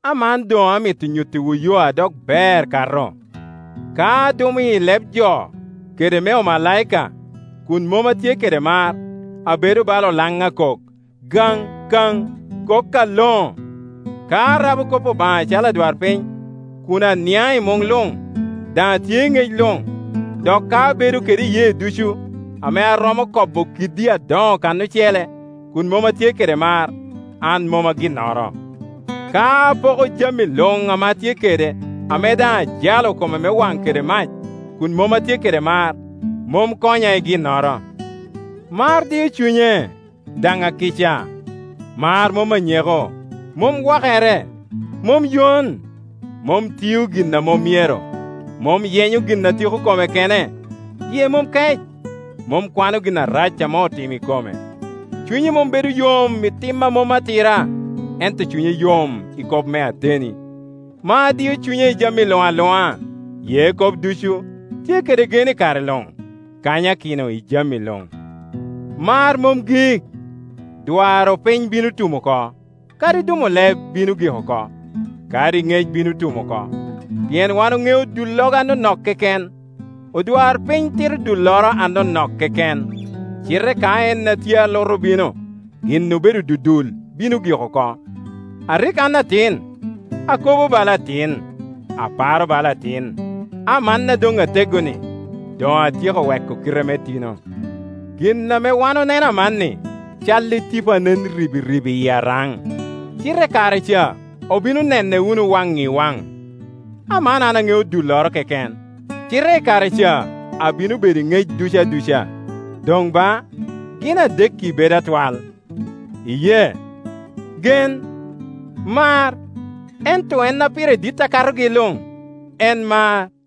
Aman doŋ amito nyuttiwu yo a dok ber kato. Ka adumo i leb jo kede me omalaika, kun mom atye kede mar, abedo bala olaŋ a kok, kakaŋ a kok aloŋo. Ka arabo kop Obaŋa acalo adwarpiny, kun aniaŋ i muŋ luŋ, daŋ atye i ŋec luŋ, dok ka abedo kede iyee ducu, ame aromo kobo kiddi adoŋo kan ocele, kun mom atye kede mar, an mom a ginnoro. Ka apoko jami luŋ ame atye kede, ame daŋ ajalo koma me waŋ kede mac, kun mom atye kede mar, mom konya i ginnoro. Mar dio cunye, daŋ akica; mar mom anyeko, mom wakere; mom yon, mom tio gin a mom myero, mom yenyo gin a tiko kome kene; yie mom kec, mom kwano gin arac ame otimo i kome; cunye mom bedo yom i tim a mom atira, ento cunye yom i kop me ateni. Mar dio cunye i jami luŋ aluŋa, ye kop ducu, tye kede gen i kare luŋ, kanyakino i jami luŋ. Mar mom gik; dwaro piny bino tum oko; kadi dumo leb bino gik oko; kadi ŋec bino tum oko. Pien wan oŋeo dullogo anonok keken, odwarpiny tito dulloro anonok keken; cite ka en a tye alutu obino, gin obedo dudul bino gik oko. A rik an atin, akobo bala atin, aparo bala atin; aman a doŋ ateggo-ni, doŋ atyeko weko kite me tino. Gin ame wan oneno amanni cal i tipo a nen ribiribi i araŋ; cite i kare ca obino nenne wunu waŋ i waŋ. Aman an aŋeo dulloro keken; cite i kare ca abino bedo i ŋec ducu aduca. Doŋ ba, gin adekki bedo atwal; iyee, gen, mar; ento en a pire dit a katogi luŋ, en mar.